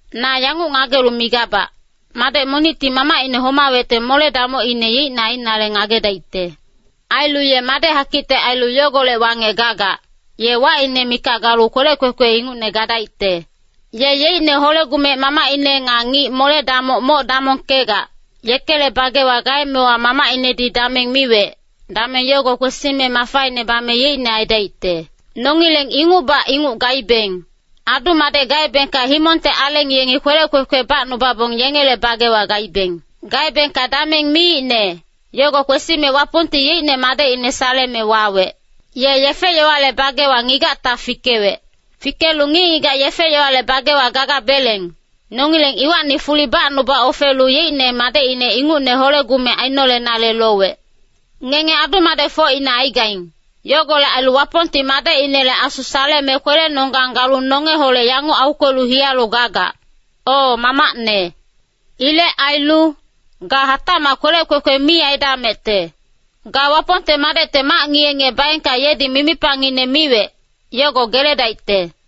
Na yanguc ngagelu migabac, madec monicti mamacine homawecte mole-damocine yeicne ainale ngagedaicte. Ailu ye madec hakicte ailu yogolec wangec gagac, ye wacine mikac galu kwelec kwekwe ingucne gadaicte. Ye yeicne hole-gumec mamacine nga ngic mole-damoc moc damongkegac, yekele bagewa gaemewa mamacinedi dameng miwec, dameng yogo kwesime mafaine bame yeicne aidaicte. Nongileng ingucbac inguc gaibeng. Adu-madec gaebengka himongte aleng yengi kwelec kwekwe bacnubabong yengele bagewa gaibeng. Gaebengka dameng miicne, yogo kwesime Wapongti yeicne Madecine saleme wawec. Ye yefe-yowale bagewa ngigacta fikewec. Fikelu ngic-ngigac yefe-yowale bagewa gagabeleng, nongileng iwacni fuli bacnuba ofelu yeicne madecine ingucne hole-gumec ainolenale lowec. Ngenge adu-madecfocine aigaing, yogolec ailu Wapongti Madecinele Asu saleme kwelenonggang galu nongeholec yanguc aukwelu hiyalu gagac, “O Mamacne.” Ilec ailu, ga hatacmac kwelec kwekwe mi aidamecte. Ga Wapongte madecte mac ngiye-ngiye baengka yedi mimipangine miwec, yogo geledaicte.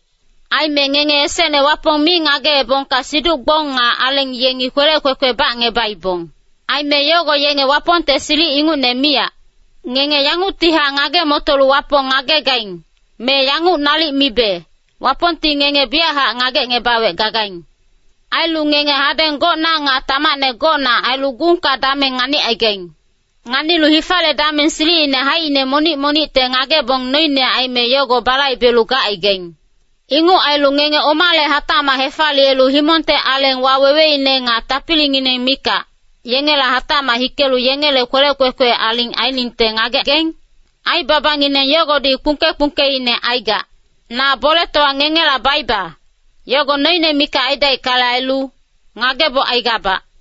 Aime ngenge esecne Wapong mi ngageebongka siduc-gbong nga aleng yengi kwelec kwekwe bacngebaibong. Aime yogo yenge Wapongte silic ingucne miyac. Ngenge yanguctihac ngage-motolu Wapong ngagegaing, me yanguc nalic mibe, Wapongti ngenge biyachac ngagecngebawec gagaing. Ailu ngenge hadeng gocna nga tamacne gocna ailu gungka dameng nganicaigaing. Nganilu hifale dameng silicine haicine monic monicte ngagebong noine aime yogo balaibelu gacaigaing. Inguc ailu ngenge omale hatacmac hefaliyelu himongte aleng waweweine nga tapilingineng mikac, yengela hatacmac hikelu yengele kwelec kwekwe aling ainingte ngagegaing? Aibabangineng yogodi kpungke-kpungkeine aigac. Na boletowa ngengela baiba, yogo noine mikac aidaickale ailu, ngageboc aigabac.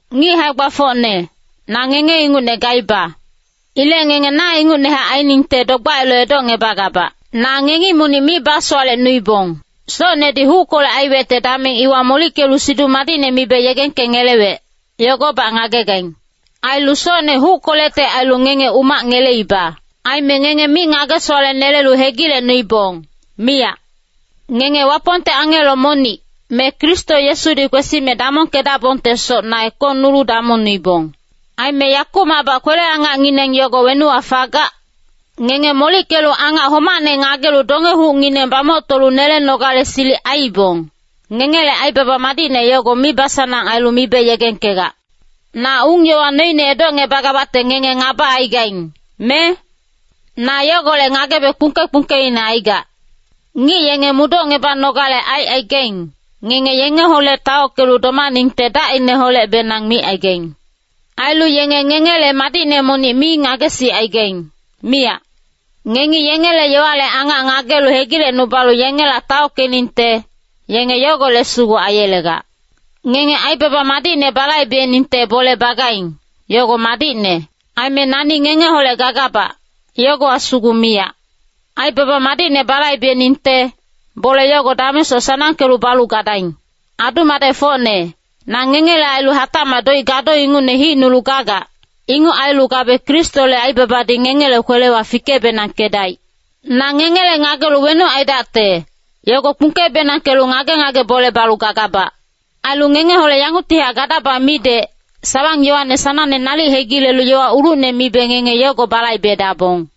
Ngic hae-gbafocne, na ngenge ingucne gaiba. Ilec ngenge na ingucnehac ainingte dogbac ailu edocngebagabac. Na ngengi monic mi basowalecnuibong. Socnedi huckolec aiwecte dameng iwa molickelu Siduc Madicne mibe yegengkengelewec, yogobac ngagegaing. Ailu socne huckolecte ailu ngenge umac ngeleiba. Aime ngenge mi ngage-sowalenelelu hegilecnuibong, miyac. Ngenge Wapongte angelo monic, me Kristo Yesudi kwesime damongkedabongtesoc na ekongnulu damongnuibong. Aime yakumacbac kwele-angacngineng yogo wenuwa fagac? Ngenge molickelu angac homacne ngagelu donge-hucngineng bamoctolu nelenogale silic aiibong, ngengele aibaba madicne yogo mibasanang ailu mibe yegengkegac. Na ung-yowa noine edocngebagabacte ngenge ngaba aigaing, me? Na yogolec ngagebe kpungke-kpungkeine aigac. Ngic yenge mudocngebanogale aicaigaing, ngenge yengeholec taockelu domaningte dacineholecbenang micaigaing. Ailu yenge ngengele madicne monic mi ngagesicaigaing, miyac. Ngengi yengele yowale angac ngagelu hegilecnubalu yengela taockeningte, yenge yogolec sugu aiyelegac. Ngenge aibaba madicne balaibeningte bole bagaing, yogo madicne. Aime nani ngengeholec gagabac, yogowa sugu miyac. Aibaba madicne balaibeningte, bole yogo damengsoc sanangkelu balu gadaing. Adu-madecfocne, na ngengele ailu hatacmac doic gado ingucne hicnulu gagac, inguc ailu gabe Kristole aibabadi ngengele kwelewa fike-benangkedaic. Na ngengele ngagelu wenuc aidacte, yogo kpungke-benangkelu ngage-ngage bole balu gagabac. Ailu ngengeholec yanguctihac gadaba midec, sawang-yowane sanangne nalic hegilelu yowa ulucne mibe ngenge yogo balaibedabong.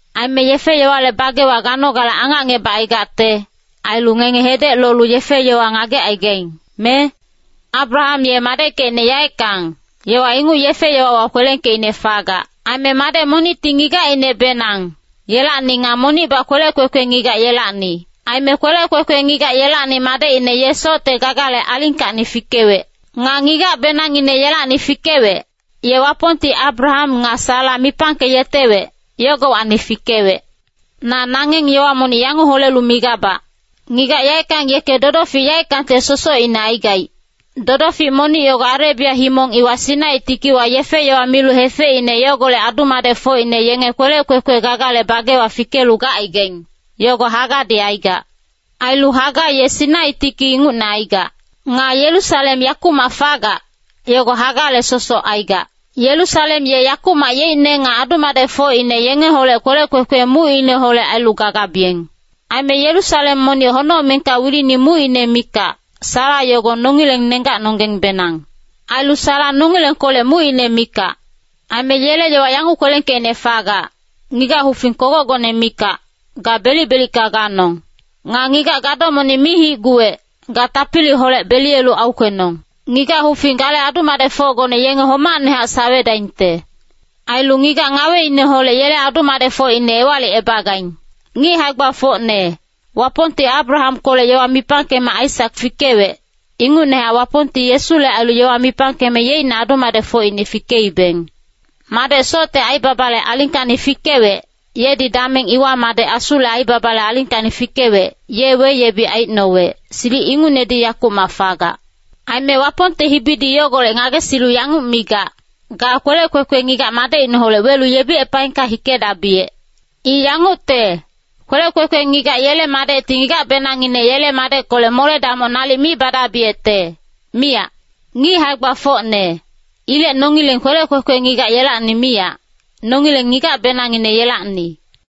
Aime yefe-yowale bagewa ganogale angacngebacaigacte, ailu ngenge hedec lolu yefe-yowa ngagecaigaing, me? Abraham ye madeckecine yaeckang, yowa inguc yefe-yowawa kwelengkeicne fagac. Aime madec monicti ngigacinebenang, yelacni nga monicbac kwelec kwekwe ngigac yelacni. Aime kwelec kwekwe ngigac yelacni madecine ye socte gagale alingkacni fikewec. Nga ngigacbenangngine yelacni fikewec, ye Wapongti Abraham nga Sara mipangkeyetewec, yogowacni fikewec. Na nangeng yowa monic yanguc holelu migabac. Ngigac yaeckang yeke dodofic yaeckangte sosocine aigaic. Dodofic monic yogo Arebia himong iwa Sinai tikiwa yefe-yowa milu hefeicne yogolec adu-madecfocine yenge kwelec kwekwe gagale bagewa fikelu gacaigaing, yogo Hagadi aigac. Ailu Haga ye Sinai tiki ingucne aigac. Nga Yerusalem yakumac fagac, yogo Hagale sosoc aigac. Yerusalem ye yakumac yeicne nga adu-madecfocine yengeholec kwelec kwekwe mucineholec ailu gagabiyeng. Aime Yerusalem monic honocmengka wilini mucine mikac, Sara yogo nongileng nenggacnonggengbenang. Ailu Sara nongilengkolec mucine mikac. Aime yele yowa yanguc kwelengkeicne fagac, “Ngigac hufing kogocgone mikac, ga belic-belicka ganong. Nga ngigac gado monic mi hicguwec, ga tapiliholec beliyelu aukwenong. Ngigac hufing gale adu-madecfocgone yenge homacnehac sawedaingte. Ailu ngigac ngaweineholec yele adu-madecfocine ewalicebagaing.” Ngic hae-gbafocne, Wapongti Abrahamkolec yowa mipangkeme Aisak fikewec, ingucnehac Wapongti Yesule ailu yowa mipangkeme yeicne adu-madecfocine fikeibeng. Madec socte aibabale alingkacni fikewec, yedi dameng iwa madec Asule aibabale alingkacni fikewec, ye weyebic aicnowec, silic ingucnedi yakumac fagac. Aime Wapongte hibidi yogolec ngagesilu yanguc migac, “Ga kwelec kwekwe ngigac madecineholec welu yebicepaengka hikedabiyec. I yangucte, kwelec kwekwe ngigac yele madecti ngigacbenangngine yele madeckolec mole-damoc nalic mi badabiyecte, miyac.” Ngic hae-gbafocne, ilec nongileng kwelec kwekwe ngigac yelacni miyac, nongileng ngigacbenangngine yelacni.